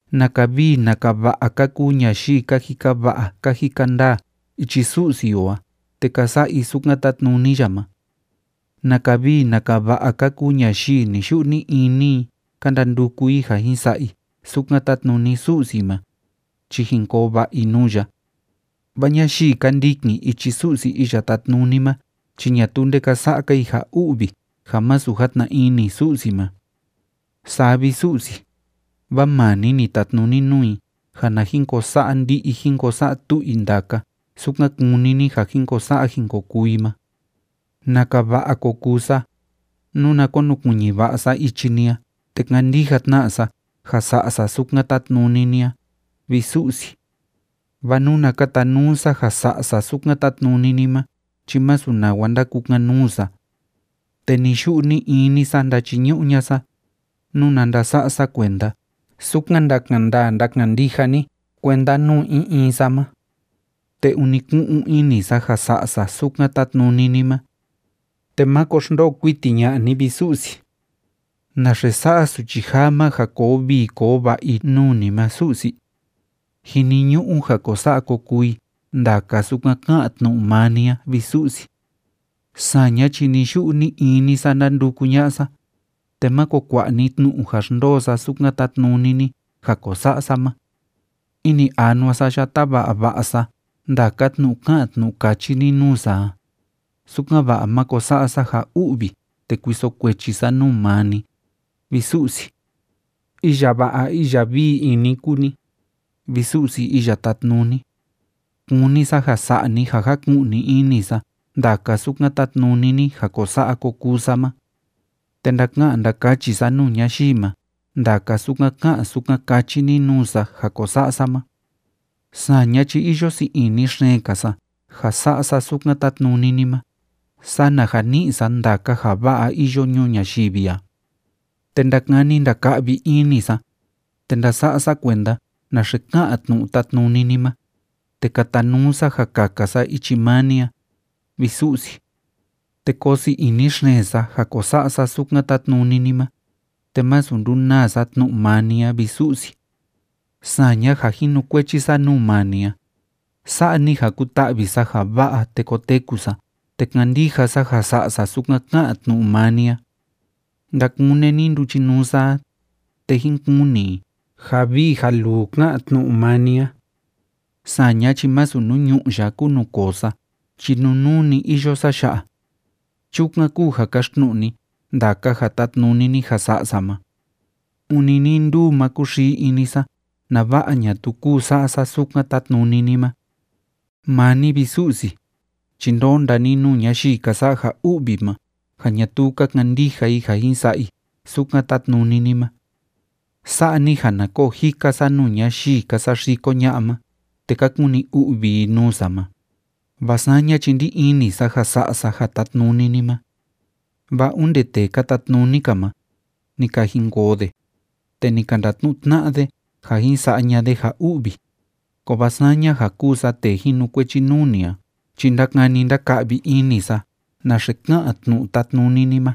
¡Naka vii naka va'a ka kuu ñayii ka jika va'a ka jika ndaa ichi Su'si o a te ka sa'a i sukan tátnuni ya ma! ¡Naka vii naka va'a ka kuu ñayii ni‑yu'u ni‑ini i ka ndanduku i ja jin sa'a i sukan tátnuni Su'si ma, chi jin koo va'a i nuu ya! Vaa ñayii ka ndikin ichi Su'si Iya Tátnuni ma chi ñatuu nde ka sa'a‑ka i ja u'vi ja masu játna ini Su'si ma. Saa vi, Su'si, vaa maa ni ni tatnuni nuu i ja na jin ko sa'a ndi'i jín ko sa'a tu'u i ndaka sukan kúni ni ja jin ko sa'a jin ko kuu i ma. ¡Naka va'a ko kuu sa, nuna konukuiñi va'a sa ichi ni a te kandija tna sa ja sa'a sa sukan tátnuni ni a, vi Su'si! Vaa nuna katanuu sa ja sa'a sa sukan tátnuni ni ma chi masu nawa ndakukan‑nuu sa. Te ni‑yu'u ni‑ini sa ndachiñu'u ña'a sa, nuna ndasa'a sa kuenda sukan ndakan ndaa ndakan ndija ni kuenda nuu in in sa ma. Te ûni ku'un ini sa ja sa'a sa sukan tátnuni ni ma. Te máko xndoo kuiti ña'a ni, vi Su'si. ¿Naxe sa'a suchi jaa ma ja koo vii koo va'a i nuu ni ma, Su'si? Jiniñu'u ja ko sa'a ko kuu i ndaka sukan ká'an tnu'u maa ni a, vi Su'si. Saña chi ni‑yu'u ni‑ini sa ndánduku ña'a sa, te máko kua'a ni tnu'u ja xndoo sa sukan tátnuni ni ja ko sa'a sa ma. Ini anua sa ya táva'a va'a sa ndaka tnu'u ká'an tnu'u káchi ni nuu sa a, sukan‑va'a ma ko sa'a sa ja u'vi te ko kuiso kuechi sa nuu maa ni, vi Su'si. Iya va'a iya vii ini kúu ni, vi Su'si Iya Tátnuni. Kúni sa ja sa'a ni ja jaku'ni ini sa ndaka sukan tátnuni ni ja ko sa'a ko kuu sa ma. Te ndaka'an ndakachi sa nuu ñayii ma ndaka sukan ká'an sukan káchi ni nuu sa ja ko sa'a sa ma. Saña chi iyo sii ini xeen‑ka sa ja sa'a sa sukan tátnuni ni ma sana ja ni'i sa ndaka ja va'a iyo ñuu ñayivi a. Te ndakani ndaka'vi ini sa, te ndasa'a sa kuenda naxe ká'an tnu'u tátnuni ni ma, te katanuu sa ja kaka sa ichi maa ni a, vi Su'si. Te koo sii ini xeen sa ja ko sa'a sa sukan tátnuni ni ma, te masu ndunaa sa tnu'u maa ni a, vi Su'si. Saña ja jinukuechi sa nuu maa ni a, sa'a ni ja kuta'vi sa ja va'a te koteku sa te kandija sa ja sa'a sa sukan ká'an tnu'u maa ni a. Ndakune ni nduchinuu sa a, te jín kuni i ja vii ja luu ká'an tnu'u maa ni a. Saña chi másu nuu ñu'ú ya kúu nuu koo sa chi nunuu‑ni iyo sa ya'a. Chukan kúu ja kaxtnu'u ni ndaka ja tátnuni ni ja sa'a sa ma. Ûni nii nduu ma kúxii ini sa nava'a ñatuu kuu sa'a sa sukan tátnuni ni ma. Maa ni, vi Su'si, chi ndónda ni nuu ñayii ka sa'a ja u'vi ma ja ñatuu ka kandija i ja jin sa'a i sukan tátnuni ni ma. Sa'a ni ja na koo jika sa nuu ñayii ka saxiko ña'a ma te ka kuni u'vi i nuu sa ma, vaa saña chi ndí ini sa ja sa'a sa ja tátnuni ni ma. Vaa onde tee ka tatnuni‑ka ma, ni ka jinkoo de, te ni ka ndatnu'u tna'a de ja jin sa'a ña'a de ja u'vi, kovaa saña ja kúu sa tee jinukuechi nuu ni a chi ndákani ndáka'vi ini sa naxe ká'an tnu'u tátnuni ni ma,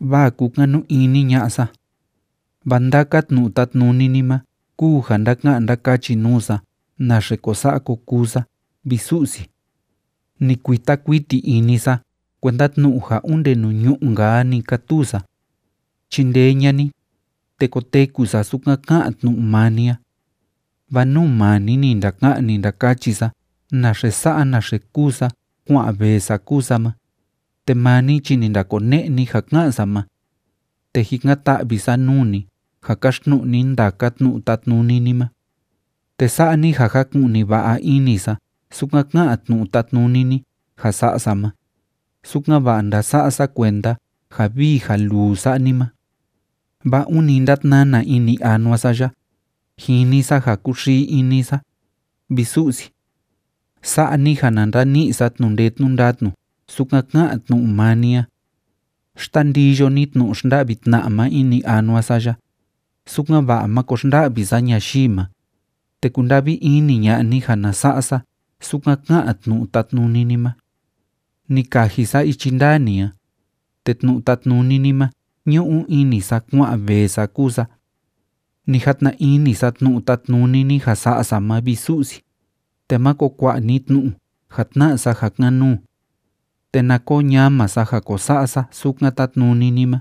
vaa kúkanu ini ña'a sa. Vaa ndaka tnu'u tátnuni ni ma kúu ja ndáka'an ndákachi nuu sa naxe ko sa'a ko kuu sa, vi Su'si. Ni kuita kuiti ini sa kuenda tnu'u ja onde nuu ñu'ú‑nka a‑ni kátuu sa. Chindee ña'a ni, te koteku sa sukan ká'an tnu'u maa ni a. Vaa nuu maa ni ni ndaka'an, ni ndakachi sa naxe sa'a naxe kúu sa kua'an vee sa kúu sa ma, te maa ni chi ni ndakone'e ni ja ká'an sa ma. Te jikan‑ta'vi sa nuu ni ja kaxtnu'u ni ndaka tnu'u tátnuni ni ma. Te sa'a ni ja jaku'ni va'a ini sa sukan ká'an tnu'u tátnuni ni ja sa'a sa ma, sukan‑va'a ndása'a sa kuenda ja vii ja luu sa'a ni ma. Vaa ûni ndátnana ini anua sa ya, jini sa ja kúxii ini sa, vi Su'si. Sa'a ni ja na ndani'i sa tnu'u ndee tnu'u ndatnu sukan ká'an tnu'u maa ni a. Xtandiyo ni tnu'u xnda'vi tna'a ma ini anua sa ya, sukan‑va'a máko xnda'vi sa ñayii ma, te kunda'vi ini ña'a ni ja na sa'a sa sukan ká'an tnu'u tátnuni ni ma. Ni kaji sa ichi ndaa ni a, te tnu'u tátnuni ni ma ñu'u ini sa kua'an vee sa kúu sa. Ni jatna ini sa tnu'u tátnuni ni ja sa'a sa ma, vi Su'si, te máko kua'a ni tnu'u ja tna'a sa ja kan‑nuu. Te na koo ñama sa ja ko sa'a sa sukan tátnuni ni ma,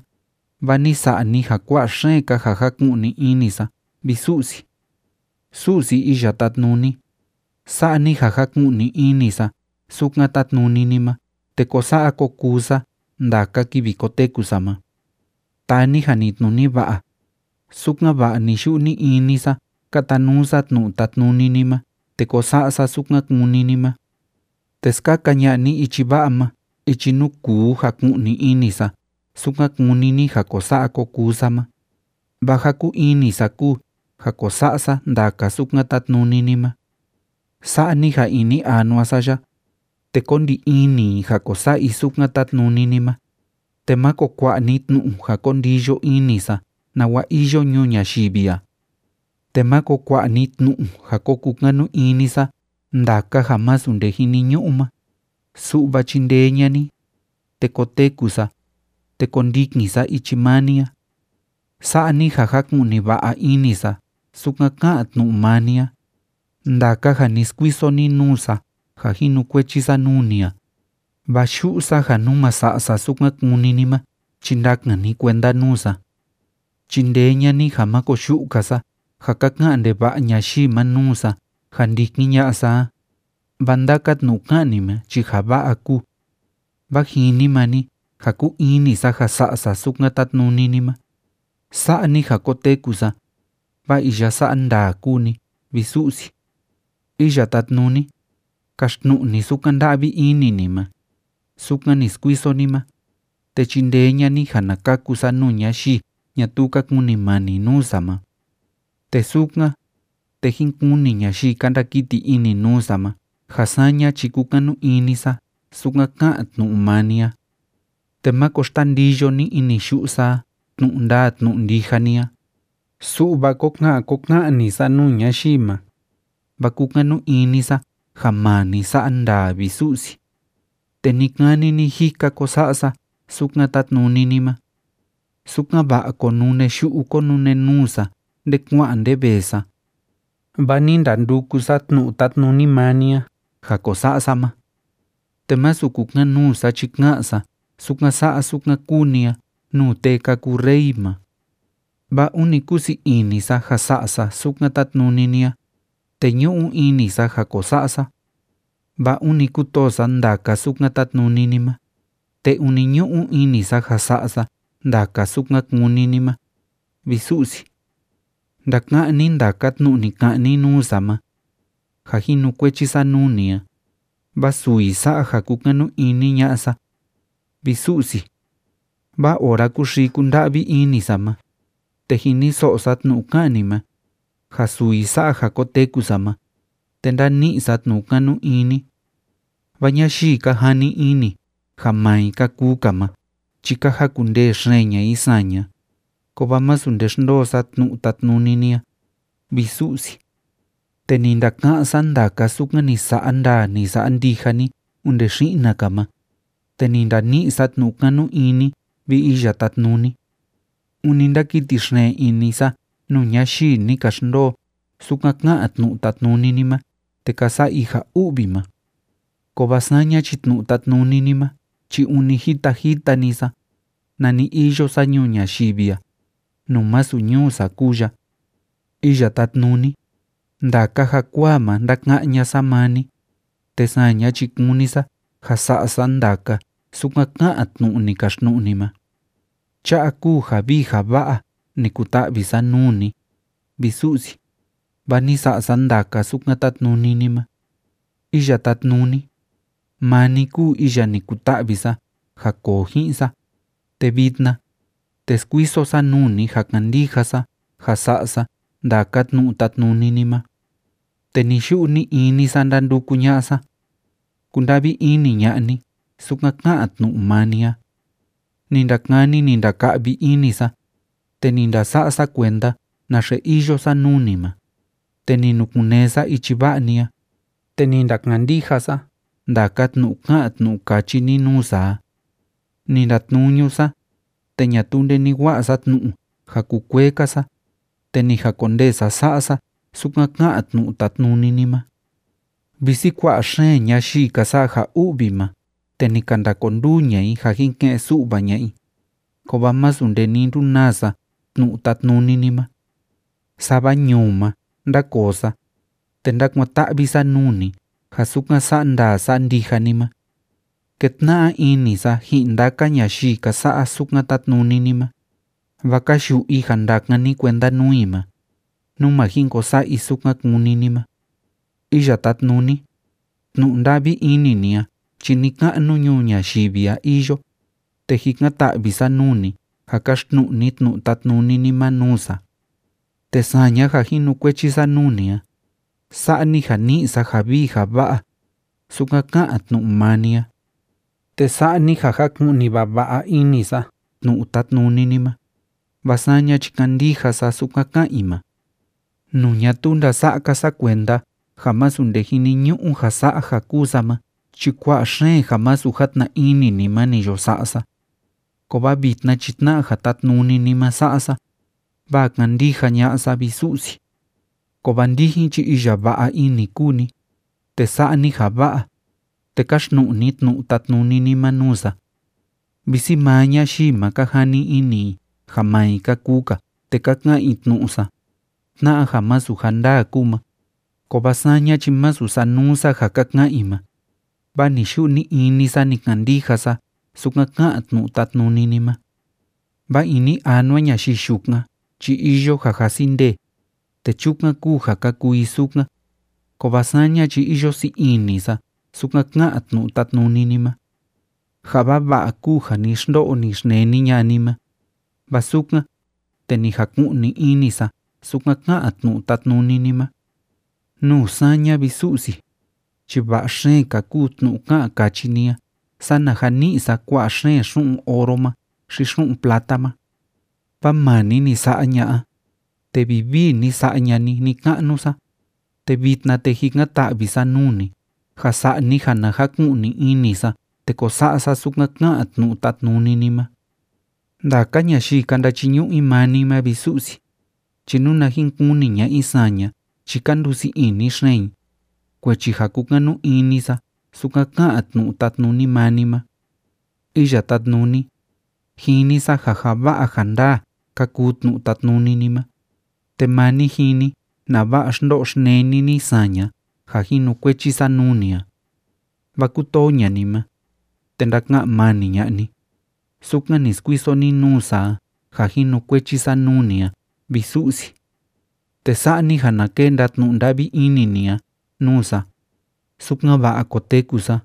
vaa ni sa'a ni ja kua'a xeen‑ka ja jáku'ni ini sa, vi Su'si. Su'si Iya Tátnuni, sa'a ni ja jaku'ni ini sa sukan tátnuni ni ma te kó sa'a kó kuu sa ndaka kivi koteku sa ma. Taa ni janitnuni va'a, sukan‑va'a ni‑yu'u ni‑ini sa kátanuu sa tnu'u tátnuni ni ma te kó sa'a sa sukan kúni ni ma. Te skaka ña'a ni ichi va'a ma ichi nuu kuu jaku'ni ini sa sukan kúni ni ja ko sa'a ko kuu sa ma, vaa ja kúu ini sa kúu ja ko sa'a sa ndaka sukan tátnuni ni ma. Sa'a ni ja ini anua sa ya, te kó ndi ini i ja ko sa'a i sukan tátnuni ni ma, te máko kua'a ni tnu'u ja ko ndiyo ini sa nawa iyo ñuu ñayivi a. Te máko kua'a ni tnu'u ja ko kukanu ini sa ndaka ja masu nde jiniñu'u ma, su'va chindee ña'a ni, te kóteku sa, te kóndikin sa ichi maa ni a. Sa'a ni ja jaku'ni va'a ini sa sukan ká'an tnu'u maa ni a, ndaka ja ni skuiso ni nuu sa ja jinukuechi sa nuu ni a, vaa yu'u sa ja nú ma sa'a sa sukan kúni ni ma chi ndakan ni kuenda nuu sa. Chindee ña'a ni ja má koyu'u‑ka sa ja ka ka'an ndeva'a ñayii ma nuu sa ja ndikin ña'a sa a, vaa ndaka tnu'u ká'an ni ma chi ja va'a kúu. Vaa jini maa ni ja kúu ini sa ja sa'a sa sukan tátnuni ni ma, sa'a ni ja koteku sa, vaa iya sa'a ndaa kúu ni, vi Su'si. Iya Tátnuni, kaxtnu'u ni sukan nda'vi ini ni ma, sukan ni skuiso ni ma, te chindee ña'a ni ja na kaku sa nuu ñayii ñatuu ka kunimani nuu sa ma. Te sukan, te jín kuni ñayii ka ndakiti ini nuu sa ma ja saña chi kúkanu ini sa sukan ká'an tnu'u maa ni a. Te máko xtandiyo ni ini yu'u sa a tnu'u ndaa tnu'u ndija ni a, su'va kó ka'an kó ka'an‑ni sa nuu ñayii ma, vaa kúkanu ini sa ja maa ni sa'a ndaa, vi Su'si. Te ni‑kani ni‑jika kó sa'a sa sukan tátnuni ni ma. Sukan‑va'a kónune yu'u kónune nuu sa nde kua'an nde vee sa, vaa ni ndanduku sa tnu'u tátnuni maa ni a ja ko sa'a sa ma. Te masu kukan‑nuu sa chi ka'an sa sukan sa'a sukan kúu ni a nuu tee ka kuu rey ma. Vaa ûni kúu sii ini sa ja sa'a sa sukan tátnuni ni a, te ñu'u ini sa ja ko sa'a sa. Vaa ûni kútoo sa ndaka sukan tátnuni ni ma, te ûni ñu'u ini sa ja sa'a sa ndaka sukan kúni ni ma, vi Su'si. Ndaka'án ni ndaka tnu'u ni ka'an ni nuu sa ma, ja jinukuechi sa nuu ni a, vaa suu i sa'a ja kúkanu ini ña'a sa, vi Su'si. Vaa ora kúxii kúnda'vi ini sa ma, te jiniso'o sa tnu'u ká'an ni ma, ja suu i sa'a ja koteku sa ma, te ndáni'i sa tnu'u kanu ini. Vaa ñayii ka jani ini ja maa i ka kuu‑ka ma chi ka jakundee xeen ña'a i saña, kovaa masu nde xndoo sa tnu'u tátnuni ni a, vi Su'si. Te ni ndaka'án sa ndaka sukan ni sa'a ndaa, ni sa'a ndija ni onde xi'na‑ka ma, te ni ndani'i sa tnu'u kanu ini, vi Iya Tátnuni. Ûni ndákiti xeen ini sa nuu ñayii ni ka xndoo sukan ká'an tnu'u tátnuni ni ma te ka sa'a i ja u'vi ma. Kovaa saña chi tnu'u tátnuni ni ma chi ûni jita jita‑ni sa nani iyo sa ñuu ñayivi a, nuu masu ñuu sa kúu ya. Iya Tátnuni, ndaka jakuaa ma ndáka'án ña'a sa maa ni, te saña chi kúni sa ja sa'a sa ndaka sukan ká'an tnu'u ni kaxtnu'u ni ma. Cha'a kúu ja vii ja va'a ni kuta'vi sa nuu ni, vi Su'si, vaa ni sa'a sa ndaka sukan tátnuni ni ma. Iya Tátnuni, maa ni kúu iya ni kuta'vi sa ja koo ji'in sa, te vitna, te skuiso sa nuu ni ja kandija sa ja sa'a sa ndaka tnu'u tátnuni ni ma. Te ni‑yu'u ni‑ini sa ndánduku ña'a sa. Kunda'vi ini ña'a ni sukan ká'an tnu'u maa ni a. Ni ndakani, ni ndaka'vi ini sa, te ni ndasa'a sa kuenda naxe iyo sa nuu ni ma, te ni nukun‑nee sa ichi va'a ni a, te ni ndakandija sa ndaka tnu'u ká'an tnu'u káchi ni nuu sa a. Ni ndatnuñu sa, te ñatuu nde ni wa'a sa tnu'u ja kukuee‑ka sa, te ni jakondee sa sa'a sa sukan ká'an tnu'u tátnuni ni ma. Visi kua'a xeen ñayii ka sa'a ja u'vi ma te ni ka ndakonduu ña'a i ja jin ke'en‑su'va ña'a i, kovaa masu nde ni ndunaa sa tnu'u tátnuni ni ma. Sava ñuu ma ndákoo sa, te ndákuan‑ta'vi sa nuu ni ja sukan sa'a ndaa sa'a ndija ni ma. Kétna'a ini sa ji'in ndaka ñayii ka sa'a sukan tátnuni ni ma, vaa ka yu'u i ja ndakan ni kuenda nuu i ma, nú ma jin ko sa'a i sukan kúni ni ma. Iya Tátnuni, tnu'u nda'vi ini ni a chi ni‑ka'nu ñuu ñayivi a iyo, te jikan‑ta'vi sa nuu ni ja kaxtnu'u ni tnu'u tátnuni ni ma nuu sa. Te saña ja jinukuechi sa nuu ni a, sa'a ni ja ni'i sa ja vii ja va'a, sukan ká'an tnu'u maa ni a. Te sa'a ni ja jaku'ni vava'a ini sa tnu'u tátnuni ni ma, vaa saña chi kándija sa sukan ka'an i ma. Nuu ñatuu ndasa'a‑ka sa kuenda ja masu nde jiniñu'u ja sa'a ja kúu sa ma chi kua'a xeen ja masu játna ini ni ma ni yo sa'a sa. Kovaa vitna chi tna'a ja tátnuni ni ma sa'a sa, vaa kándija ña'a sa, vi Su'si. Kovaa ndijin chi iya va'a ini kúu ni, te sa'a ni ja va'a, te káxtnu'u ni tnu'u tátnuni ni ma nuu sa. Visi maa ñayii ma ka jani ini i ja maa i ka kuu‑ka te ka ka'an i tnu'u sa, tna'a ja masu ja ndaa kúu ma, kovaa saña chi masu sanuu sa ja ka ka'an i ma, vaa ni‑yu'u ni‑ini sa ni kandija sa sukan ká'an tnu'u tátnuni ni ma. Vaa ini anua ñayii yukan chi iyo ja jasi ndee, te chukan kúu ja ka kuu i sukan, kovaa saña chi iyo sii ini sa sukan ká'an tnu'u tátnuni ni ma. Ja vava'a kúu ja ni xndo'o, ni xneni ña'a ni ma, vaa sukan, te ni jaku'ni ini sa sukan ká'an tnu'u tátnuni ni ma. Nuu saña, vi Su'si, chi va'a xeen‑ka kúu tnu'u ká'an káchi ni a sana ja ni'i sa kua'a xeen xu'un oro ma xi xu'un plata ma. Vaa maa ni ni sa'a ña'a, te vivii ni sa'a ña'a ni ni‑ka'nu sa, te vitna, te jikan‑ta'vi sa nuu ni ja sa'a ni ja na jaku'ni ini sa te ko sa'a sa sukan ká'an tnu'u tátnuni ni ma. Ndaka ñayii ka ndachiñu'u i maa ni ma, vi Su'si, chi nuna jin kuni ña'a i saña chi ka ndusii ini xeen i, kuechi ja kúkanu ini sa sukan ká'an tnu'u tátnuni maa ni ma. Iya Tátnuni, jini sa ja ja va'a ja ndaa ka kuu tnu'u tátnuni ni ma, te maa ni jini nava'a xndo'o xneni ni saña ja jinukuechi sa nuu ni a. Vaa kútoo ña'a ni ma, te ndaka'an mani ña'a ni, sukan ni skuiso ni nuu sa a ja jinukuechi sa nuu ni a, vi Su'si. Te sa'a ni ja na kenda tnu'u nda'vi ini ni a nuu sa, sukan‑va'a koteku sa,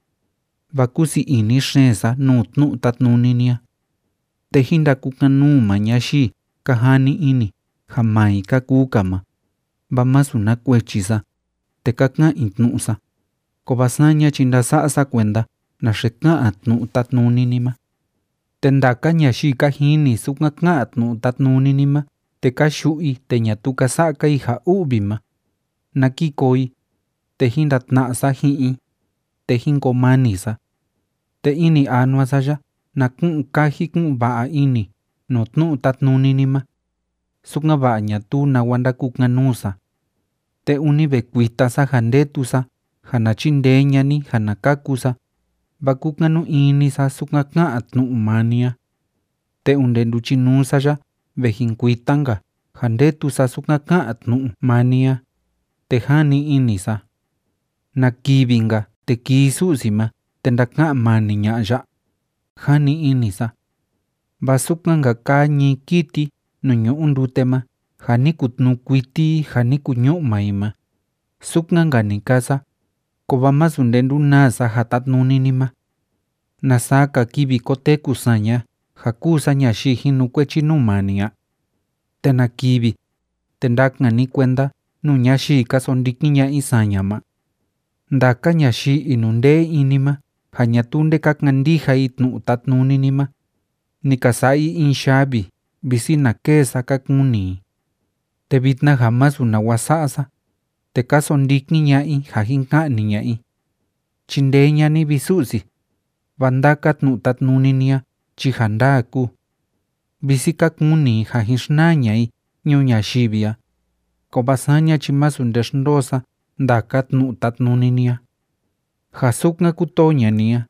vaa kúu sii ini xeen sa nuu tnu'u tátnuni ni a. Te jín ndakukan‑nuu maa ñayii ka jani ini ja maa i ka kuu‑ka ma, vaa masu na kuechi sa, te ka ka'an i tnu'u sa, kovaa saña chi ndása'a sa kuenda naxe ká'an tnu'u tátnuni ni ma. Te ndaka ñayii ka jini sukan ká'an tnu'u tátnuni ni ma te ka yu'u i te ñatuu ka sa'a‑ka i ja u'vi ma, na ki koo i, te jín ndatna'a sa ji'in i, te jín koo mani sa. Te ini anua sa ya na ku'un kaji kú'un va'a ini nuu tnu'u tátnuni ni ma, sukan‑va'a ñatuu nawa ndakukan‑nuu sa. Te ûni ve kuita sa ja ndetu sa ja na chindee ña'a ni ja na kaku sa, vaa kúkanu ini sa sukan ká'an tnu'u maa ni a. Te onde nduchinuu sa ya ve jin kuita‑nka ja ndétu sa sukan ká'an tnu'u maa ni a, te jani ini sa: “¿Na kivi‑nka, te kii Su'si ma te ndaka'an mani ña'a ya?”, jani ini sa. Vaa sukan‑nka kaa ñii kiti nuu ñu'u ndute ma ja ni kutnuu kuiti i ja ni kuñu'ma i ma, sukan‑nka ni kaa sa, kovaa masu nde ndunaa sa ja tátnuni ni ma. ¿Na saa‑ka kivi koteku saña ja kúu sa ñayii jinukuechi nuu maa ni a? ¿Te na kivi, te ndakan ni kuenda nuu ñayii ka sondikin ña'a i saña ma? Ndaka ñayii inundee ini ma ja ñatuu nde ka kandija i tnu'u tátnuni ni ma, ni ka sa'a i in yavi visi na kêe sa, ka kuni i. Te vitna ja masu nawa sa'a sa, te ka sondikin ña'a i ja jin ka'ni ña'a i. Chindee ña'a ni, vi Su'si, vaa ndaka tnu'u tátnuni ni a chi ja ndaa kúu. Visi ka kuni i ja jin xnaa ña'a i ñuu ñayivi a, kovaa saña chi masu nde xndoo sa ndaka tnu'u tátnuni ni a. Ja sukan kútoo ña'a ni a,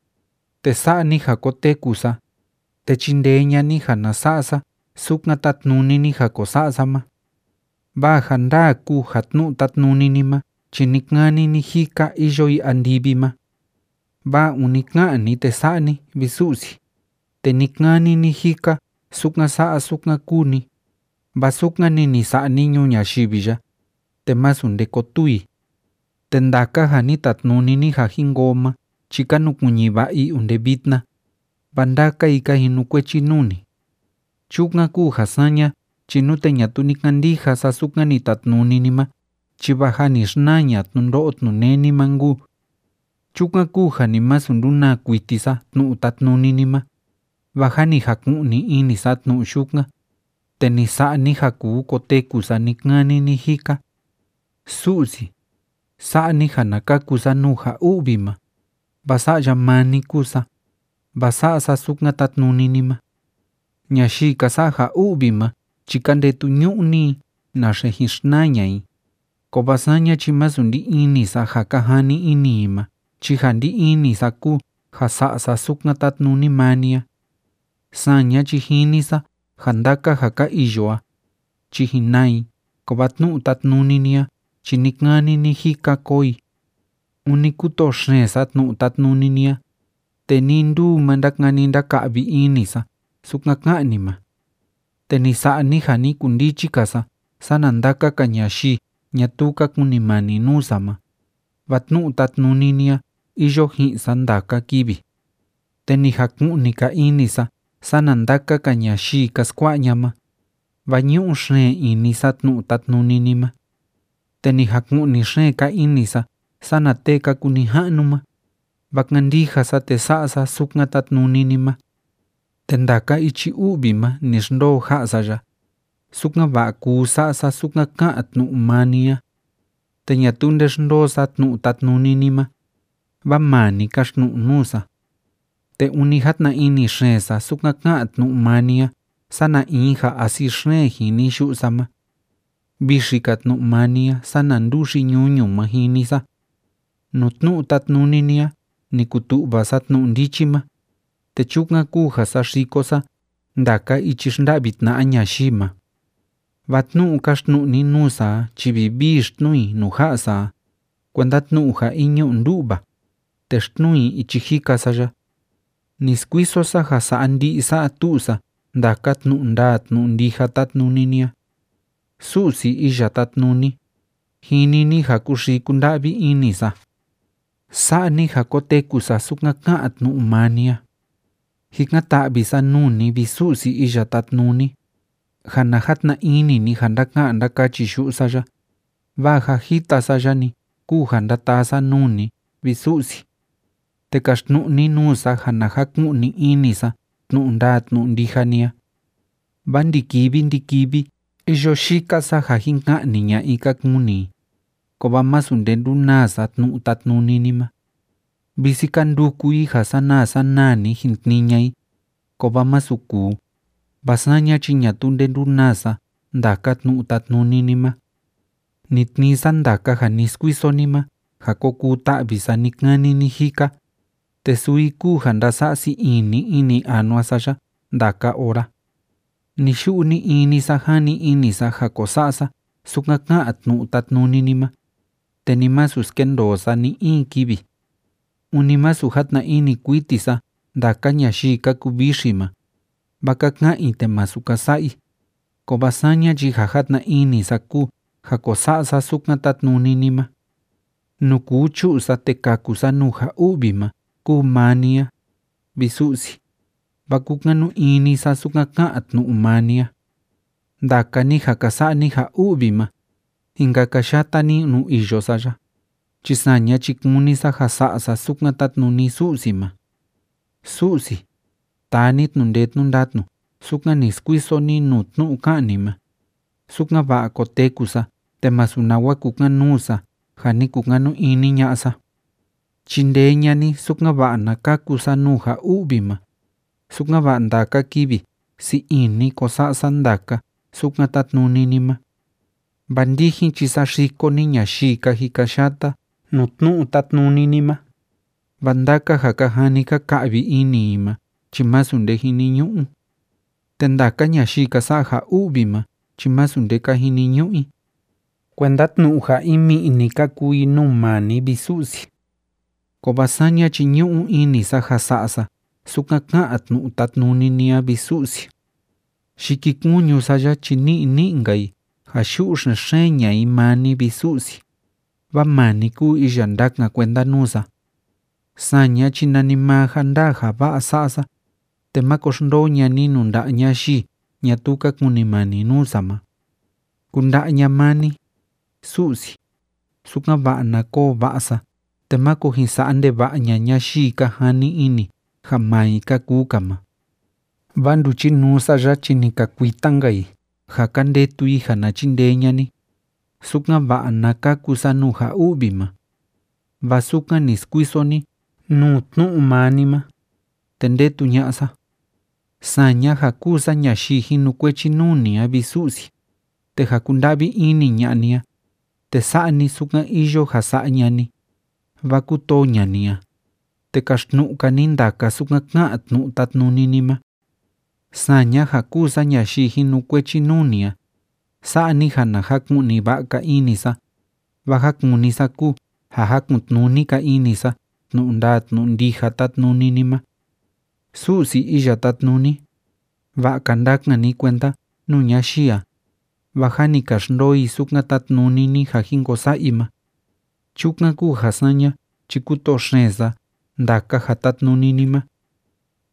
te sa'a ni ja koteku sa, te chindee ña'a ni ja na sa'a sa sukan tátnuni ni ja ko sa'a sa ma. Vaa ja ndaa kúu ja tnu'u tátnuni ni ma chi ni‑kani ni‑jika iyo i andivi ma. Vaa ûni ká'an ni, te sa'a ni a, vi Su'si, te ni‑kani ni‑jika sukan sa'a sukan kúu ni, vaa sukan‑ni ni sa'a ni ñuu ñayivi ya, te masu nde kotuu i. Te ndaka ja ni tatnuni ni ja jin koo ma chi ka nukuiñi va'a i onde vitna, vaa ndaka i ka jinukuechi nuu ni. Chukan kúu ja saña chi nute ñatuu ni kandija sa sukan ni tatnuni ni ma chi vaa jâ ni xnaa ña'a tnundo'o tnuneni ma nkuu. Chukan kúu ja ni masu ndunaa kuiti sa tnu'u tátnuni ni ma, vaa ja ni jaku'ni ini sa tnu'u yukan, te ni sa'a ni ja kuu koteku sa ni‑kani ni‑jika. Su'si, sa'a ni ja na kaku sa nuu ja u'vi ma, vaa sa'ya maa ni kúu sa, vaa sa'a sa sukan tátnuni ni ma. Ñayii ka sa'a ja u'vi ma chi ka ndetu ñu'ni i naxe jin xnaa ña'a i, kovaa saña chi masu ndí ini sa ja ka jani ini i ma chi ja ndí ini sa kúu ja sa'a sa sukan tátnuni maa ni a. Saña chi jini sa ja ndaka ja ka iyo a chi jin naa i, kovaa tnu'u tátnuni ni a chi ni‑kani ni‑jika koo i. Ûni kútoo xeen sa tnu'u tátnuni ni a, te nii nduu ma ndákani ndáka'vi ini sa sukan ká'an ni ma. Te ni sa'a ni ja ni kundichi‑ka sa sana ndaka‑ka ñayii ñatuu ka kunimani nuu sa ma, vaa tnu'u tátnuni ni a iyo ji'in sa ndaka kivi. Te ni jaku'ni‑ka ini sa sana ndaka‑ka ñayii ka skua'a ña'a ma, vaa ñu'u xeen ini sa tnu'u tátnuni ni ma. Te ni jaku'ni xeen‑ka ini sa sana tee ka kuu nija'nu ma, vaa kándija sa te sa'a sa sukan tátnuni ni ma. Te ndaka ichi u'vi ma ni xndoo ja'a sa ya, sukan‑va'a kuu sa'a sa sukan ká'an tnu'u maa ni a. Te ñatuu nde xndoo sa tnu'u tátnuni ni ma, vaa maa ni káxtnu'u nuu sa. Te ûni játna ini xeen sa sukan ká'an tnu'u maa ni a sana in ja asi xeen jini yu'u sa ma. Vixi‑ka tnu'u maa ni a sana nduxi ñuñu ma jini sa. Nuu tnu'u tátnuni ni a ni kutu'va sa tnu'u ndichi ma, te chukan kúu ja saxiko sa ndaka ichi xnda'vi tna'a ñayii ma. Vaa tnu'u káxtnu'u ni nuu sa a chi vivii xtnuu i nuu ja'a sa a, kuenda tnu'u ja in ñu'u ndu'va, te xtnuu i ichi jika sa ya. Ni skuiso sa ja sa'a ndi'i sa'a tu'u sa ndaka tnu'u ndaa tnu'u ndija tátnuni ni a. Su'si Iya Tátnuni, jini ni ja kúxii kúnda'vi ini sa. Sa'a ni ja koteku sa sukan ká'an tnu'u maa ni a. Jikan‑ta'vi sa nuu ni, vi Su'si Iya Tátnuni, ja na jatna ini ni ja ndáka'an ndákachi yu'u sa ya, vaa ja jita sa ya‑ni kúu ja ndátaa sa nuu ni, vi Su'si. Te kaxtnu'u ni nuu sa ja na jaku'ni ini sa tnu'u ndaa tnu'u ndija ni a. Vaa ndi‑kivi ndi‑kivi iyo yika sa ja jin ka'ni ña'a i ka kuni i, kovaa masu nde ndunaa sa tnu'u tátnuni ni ma. Visi ka nduku i ja sanaa sanaa‑ni jin tnii ña'a i, kovaa masu kuu, vaa saña chi ñatuu nde ndunaa sa ndaka tnu'u tátnuni ni ma. Ni tnii sa ndaka ja ni skuiso ni ma ja ko kuu ta'vi sa ni‑kani ni‑jika, te suu i kúu ja ndása'a sii ini ini anua sa ya ndaka ora. Ni‑yu'u ni‑ini sa jani ini sa ja ko sa'a sa sukan ká'an tnu'u tátnuni ni ma, te ni masu skendoo sa ni‑in kivi. Ûni masu játna ini kuiti sa ndaka ñayii ka kuvixi ma, vaa ka ka'an i te masu ka sa'a i, kovaa saña chi ja játna ini sa kúu ja ko sa'a sa sukan tátnuni ni ma. Nuu kuu chu'u sa te kaku sa nuu ja u'vi ma kúu nuu maa ni a, vi Su'si, vaa kúkanu ini sa sukan ká'an tnu'u maa ni a. Ndaka ni ja ka sa'a ni ja u'vi ma, jin kakayata ni nuu iyo sa ya, chi saña chi kúni sa ja sa'a sa sukan tátnuni Su'si ma. Su'si, taa ni tnu'u ndee tnu'u ndatnu sukan ni skuiso ni nuu tnu'u ká'an ni ma, sukan‑va'a koteku sa te masu nawa kukan‑nuu sa ja ni kukanu ini ña'a sa. Chindee ña'a ni, sukan‑va'a na kaku sa nuu ja u'vi ma, sukan‑va'a ndaka kivi sii ini ko sa'a sa ndaka sukan tátnuni ni ma. Vaa ndijin chi saxiko ni ñayii ka jikayata nuu tnu'u tátnuni ni ma, vaa ndaka ja ka jani ka ka'vi ini i ma chi masu nde jiniñu'u. Te ndaka ñayii ka sa'a ja u'vi ma chi masu nde ka jiniñu'u i. Kuenda tnu'u ja in mi'i‑ni ka kúu i nuu maa ni, vi Su'si. Kovaa saña chi ñu'u ini sa ja sa'a sa sukan ká'an tnu'u tátnuni ni a, vi Su'si. Yikikuñu sa ya chi ni'i ni'i‑nka i ja yu'u xen‑xeen ña'a i maa ni, vi Su'si, vaa maa ni kúu iya ndakan kuenda nuu sa. Saña chi nanimaa ja ndaa ja va'a sa'a sa, te máko xndoo ña'a ni nuu nda'a ñayii ñatuu ka kunimani nuu sa ma. Kunda'a ña'a maa ni, Su'si, sukan‑va'a na koo va'a sa te máko jin sa'a ndeva'a ña'a ñayii ka jani ini ja maa i ka kuu‑ka ma. Vaa nduchinuu sa ya chi ni ka kuita‑nka i ja ka ndetu i ja na chindee ña'a ni, sukan‑va'a na kaku sa nuu ja u'vi ma, vaa sukan ni skuiso ni nuu tnu'u maa ni ma, te ndetu ña'a sa. Saña ja kúu sa ñayii jinukuechi nuu ni a, vi Su'si, te ja kúnda'vi ini ña'a ni a, te sa'a ni sukan iyo ja sa'a ña'a ni, vaa kútoo ña'a ni a, te kaxtnu'u‑ka ni ndaka sukan ká'an tnu'u tátnuni ni ma. Saña ja kúu sa ñayii jinukuechi nuu ni a, sa'a ni ja na jaku'ni va'a‑ka ini sa, vaa ja kúni sa kúu ja jakun‑tnuni‑ka ini sa tnu'u ndaa tnu'u ndija tátnuni ni ma. Su'si Iya Tátnuni, va'a‑ka ndakan ni kuenda nuu ñayii a, vaa jâ ni ka xndoo i sukan tátnuni ni ja jin ko sa'a i ma. Chukan kúu ja saña chi kútoo xeen sa ndaka ja tátnuni ni ma.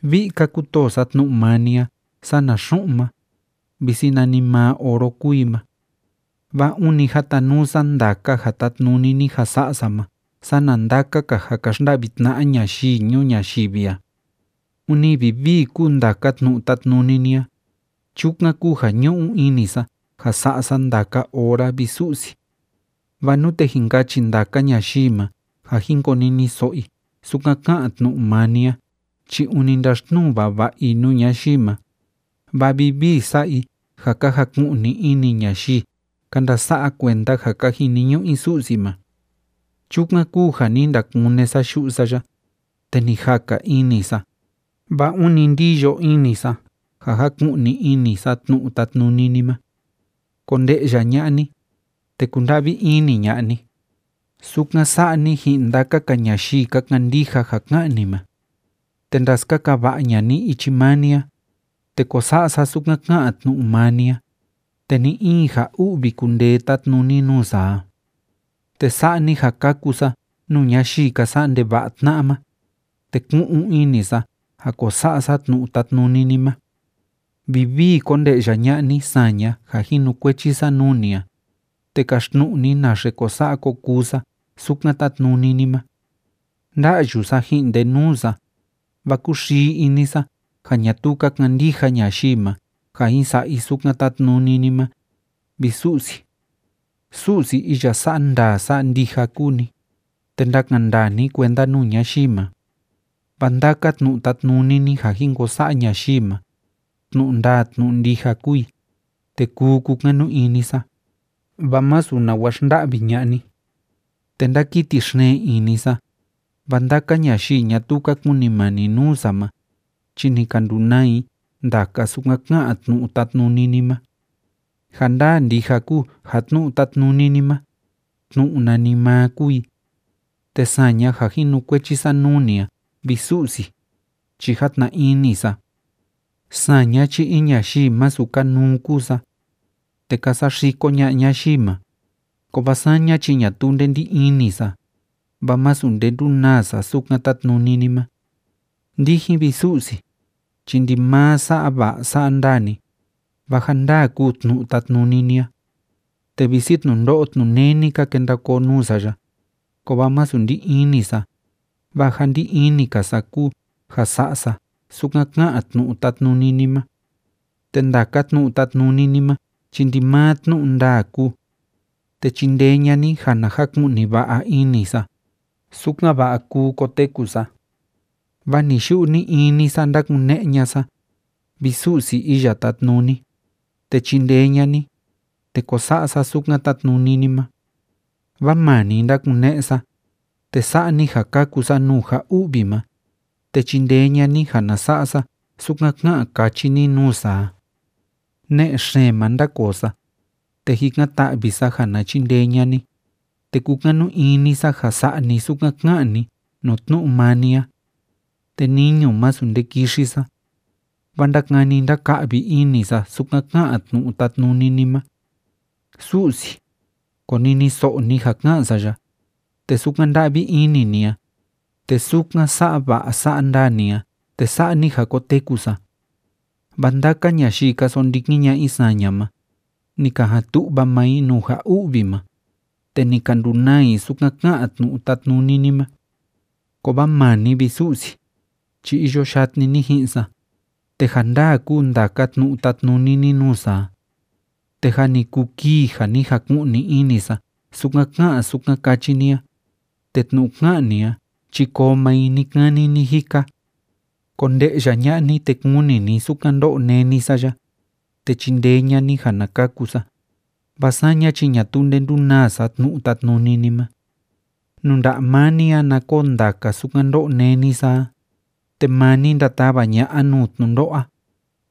Vi'i‑ka kútoo sa tnu'u maa ni a sana xu'un ma, visi nanimaa oro kúu i ma. Vaa ûni jatanuu sa ndaka ja tátnuni ni ja sa'a sa ma sana ndaka‑ka ja ka xnda'vi tna'a ñayii ñuu ñayivi a. Ûni vivii kúu ndaka tnu'u tátnuni ni a. Chukan kúu ja ñu'u ini sa ja sa'a sa ndaka ora, vi Su'si. Vaa nute jin kachi ndaka ñayii ma ja jin koniniso'o i sukan ká'an tnu'u maa ni a chi ûni ndaxtnuu vava'a i nuu ñayii ma, vaa vivii sa'a i ja ka jaku'ni ini ñayii ka ndasa'a kuenda ja ka jiniñu'u i Su'si ma. Chukan kúu ja ni ndakune sa yu'u sa ya, te ni jaka ini sa, vaa ûni ndiyo ini sa ja jaku'ni ini sa tnu'u tátnuni ni ma. Konde'ya ña'a ni, te kunda'vi ini ña'a ni, sukan sa'a ni ji'in ndaka‑ka ñayii ka kandija ja ká'an ni ma. Te ndaskaka va'a ña'a ni ichi maa ni a, te kó sa'a sa sukan ká'an tnu'u maa ni a, te ni‑in ja u'vi kundee tatnuni nuu sa a. Te sa'a ni ja kaku sa nuu ñayii ka sa'a ndeva'a tna'a ma, te ku'un ini sa ja ko sa'a sa tnu'u tátnuni ni ma. Vivii konde'ya ña'a ni saña ja jinukuechi sa nuu ni a, te kaxtnu'u ni naxe ko sa'a ko kuu sa sukan tátnuni ni ma. Nda'yu sa ji'in ndenuu sa, vaa kúxii ini sa ja ñatuu ka kandija ñayii ma ja jin sa'a i sukan tátnuni ni ma, vi Su'si. Su'si iya sa'a ndaa sa'a ndija kúu ni, te ndakan ndandaa ni kuenda nuu ñayii ma. Vaa ndaka tnu'u tátnuni ni ja jin ko sa'a ñayii ma, tnu'u ndaa tnu'u ndija kúu i, te kuu kukanu ini sa, vaa masu nawa xnda'vi ña'a ni. Te ndákiti xeen ini sa, vaa ndaka ñayii ñatuu ka kunimani nuu sa ma, chi ni ka ndunaa i ndaka sukan ká'an tnu'u tátnuni ni ma. Ja ndaa ndija kúu ja tnu'u tátnuni ni ma, tnu'u nanimaa kúu i, te saña ja jinukuechi sa nuu ni a, vi Su'si, chi játna ini sa. Saña chi in ñayii masu kanuu kúu sa, te ka saxiko ña'a ñayii ma, kovaa saña chi ñatuu nde ndí ini sa, vaa masu nde ndunaa sa sukan tátnuni ni ma. Ndijin, vi Su'si, chi ndimaa sa'a va'a sa'a ndaa ni, vaa ja ndaa kúu tnu'u tátnuni ni a. Te visi tnundo'o tnuneni ka kenda koo nuu sa ya, kovaa masu ndí ini sa, vaa ja ndí ini‑ka sa kúu ja sa'a sa sukan ká'an tnu'u tátnuni ni ma. Te ndaka tnu'u tátnuni ni ma chi ndimaa tnu'u ndaa kúu. Te chindee ña'a ni ja na jaku'ni va'a ini sa, sukan‑va'a kuu koteku sa. Vaa ni‑yu'u ni‑ini sa ndákune'e ña'a sa, vi Su'si Iya Tátnuni, te chindee ña'a ni, te kó sa'a sa sukan tátnuni ni ma. Vaa maa ni ndákune'e sa, te sa'a ni ja kaku sa nuu ja u'vi ma, te chindee ña'a ni ja na sa'a sa sukan ká'an káchi ni nuu sa a. Ne'e xeen ma ndákoo sa, te jikan‑ta'vi sa ja na chindee ña'a ni, te kúkanu ini sa ja sa'a ni sukan ká'an ni nuu tnu'u maa ni a. Te niñu masu nde kixi sa, vaa ndákani ndáka'vi ini sa sukan ká'an tnu'u tátnuni ni ma. Su'si, koniniso'o ni ja ká'an sa ya, te sukan nda'vi ini ni a, te sukan sa'a va'a sa'a ndaa ni a, te sa'a ni ja koteku sa. Vaa ndaka ñayii ka sondikin ña'a i saña ma, ni ka jan tu'va maa i nuu ja u'vi ma, te ni ka ndunaa i sukan ká'an tnu'u tátnuni ni ma. Kovaa maa ni, vi Su'si, chi iyo yatni ni ji'in sa, te ja ndaa kúu ndaka tnu'u tátnuni ni nuu sa a. Te jâ ni kuu kii ja ni jaku'ni ini sa sukan ká'an sukan káchi ni a, te tnu'u ká'an ni a chi koo maa i ni‑kani ni‑jika. Konde'ya ña'a ni, te kuni ni sukan ndó'o néni sa ya, te chindee ña'a ni ja na kaku sa, vaa saña chi ñatuu nde ndunaa sa tnu'u tátnuni ni ma. Nuu nda'a maa ni a na koo ndaka sukan ndó'o néni sa a, te maa ni ndatava ña'a nuu tnundo'o a,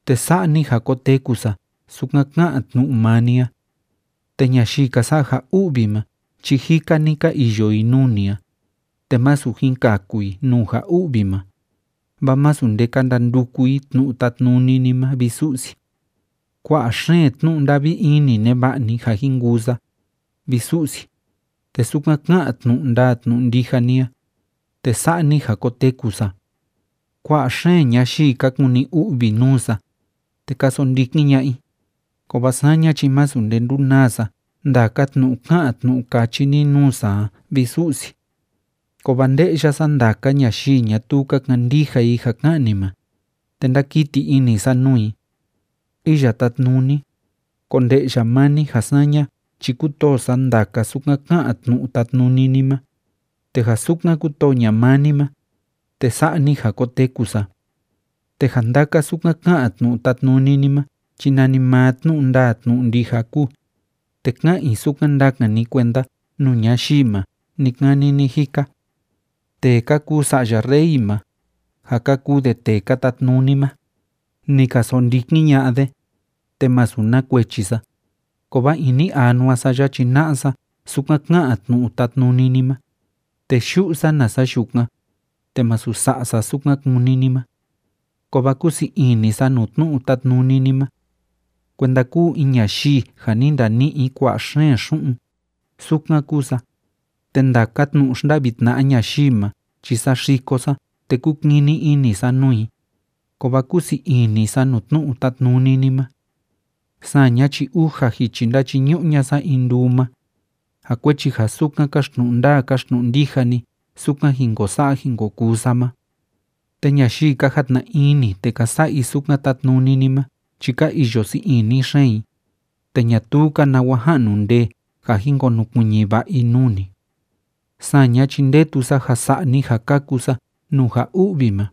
te sa'a ni ja koteku sa sukan ká'an tnu'u maa ni a. Te ñayii ka sa'a ja u'vi ma chi jika‑ni ka iyo i nuu ni a, te masu jin kaku i nuu ja u'vi ma, vaa masu nde ka ndanduku i tnu'u tátnuni ni ma, vi Su'si. Kua'a xeen tnu'u nda'vi ini neva'a ni ja jin kuu sa, vi Su'si, te sukan ká'an tnu'u ndaa tnu'u ndija ni a, te sa'a ni ja koteku sa. Kua'a xeen ñayii ka kuni u'vi nuu sa, te ka sondikin ña'a i, kovaa saña chi masu nde ndunaa sa ndaka tnu'u ká'an tnu'u káchi ni nuu sa a, vi Su'si. Kovaa nde'ya sa ndaka ñayii ñatuu ka kandija i ja ká'an ni ma, te ndákiti ini sa nuu i. Iya Tátnuni, konde'ya maa ni ja saña chi kútoo sa ndaka sukan ká'an tnu'u tátnuni ni ma, te ja sukan kútoo ña'a maa ni ma, te sa'a ni ja koteku sa. Te ja ndaka sukan ká'an tnu'u tátnuni ni ma chi nanimaa tnu'u ndaa tnu'u ndija kúu, te ká'an i sukan ndakan ni kuenda nuu ñayii ma ni‑kani ni‑jika. Tee ka kuu sa'ya rey ma, ja ka kuu de tee ka tatnuni ma, ni ka sondikin ña'a de, te masu na kuechi sa, kovaa ini anua sa ya chi na'a sa sukan ká'an tnu'u tátnuni ni ma, te yu'u sa nasa yukan, te masu sa'a sa sukan kúni ni ma. Kovaa kúu sii ini sa nuu tnu'u tátnuni ni ma. Kuenda kúu in ñayii ja ni ndani'i i kua'a xeen xu'un, sukan kúu sa. Te ndaka tnu'u xnda'vi tna'a ñayii ma chi saxiko sa te kúkini ini sa nuu i, kovaa kúu sii ini sa nuu tnu'u tátnuni ni ma. Saña chi uja jichi ndáchiñu'u ña'a sa in nduu ma, ja kuechi ja sukan káxtnu'u ndaa káxtnu'u ndija ni sukan jin ko sa'a jin ko kuu sa ma. Te ñayii ka jatna ini te ka sa'a i sukan tátnuni ni ma chi ka iyo sii ini xeen i, te ñatuu‑ka nawa ja'nu ndee ja jin konukuiñi va'a i nuu ni. Saña chi ndetu sa ja sa'a ni ja kaku sa nuu ja u'vi ma,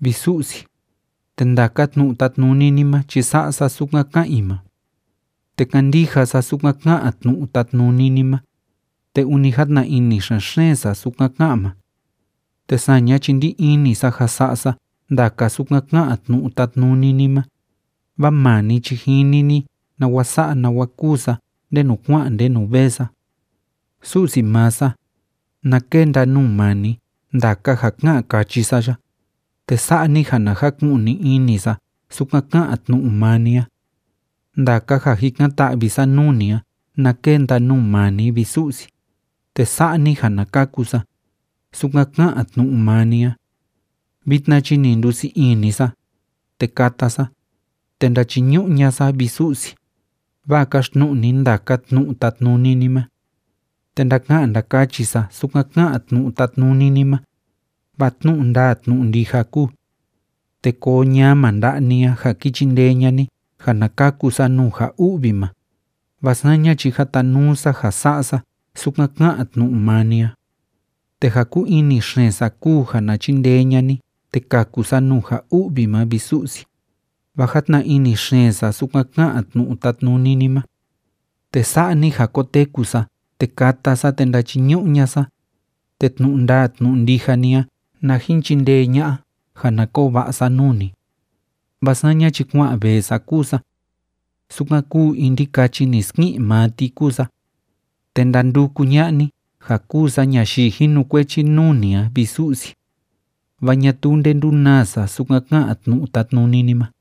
vi Su'si, te ndaka tnu'u tátnuni ni ma chi sa'a sa sukan ká'an i ma. Te kándija sa sukan ká'an tnu'u tátnuni ni ma, te ûni játna ini xen‑xeen sa sukan ká'an ma. Te saña chi ndí ini sa ja sa'a sa ndaka sukan ká'an tnu'u tátnuni ni ma, vaa maa ni chi jini ni nawa sa'a nawa kúu sa ndenu kua'an ndenu vee sa. Su'si maa sa, na kenda nuu maa ni ndaka ja ká'an kachi sa ya, te sa'a ni ja na jaku'ni ini sa sukan ká'an tnu'u maa ni a. Ndaka ja jikan‑ta'vi sa nuu ni a na kenda nuu maa ni, vi Su'si, te sa'a ni ja na kaku sa, sukan ká'an tnu'u maa ni a. Vitna chi ni ndusii ini sa, te kata sa, te ndachiñu'u ña'a sa, vi Su'si, vaa káxtnu'u ni ndaka tnu'u tátnuni ni ma. Te ndaka'an ndakachi sa sukan ká'an tnu'u tátnuni ni ma, vaa tnu'u ndaa tnu'u ndija kúu. Te koo ñama nda'a ni a ja ki chindee ña'a ni ja na kaku sa nuu ja u'vi ma, vaa saña chi jatanuu sa ja sa'a sa sukan ká'an tnu'u maa ni a. Te ja kúu ini xeen sa kúu ja na chindee ña'a ni te káku sa nuu ja u'vi ma, vi Su'si, vaa játna ini xeen sa sukan ká'an tnu'u tátnuni ni ma. Te sa'a ni ja kóteku sa te káta sa te ndáchiñu'u ña'a sa, te tnu'u ndaa tnu'u ndija ni a na jin chindee ña'a ja na koo va'a sa nuu ni. Vaa saña chi kua'an vee sa kúu sa. Sukan kúu in ndikachi ni ski'in maa ti kúu sa. Te ndanduku ña'a ni ja kúu sa ñayii jinukuechi nuu ni a, vi Su'si, vaa ñatuu nde ndúnaa sa sukan ká'an tnu'u tátnuni ni ma.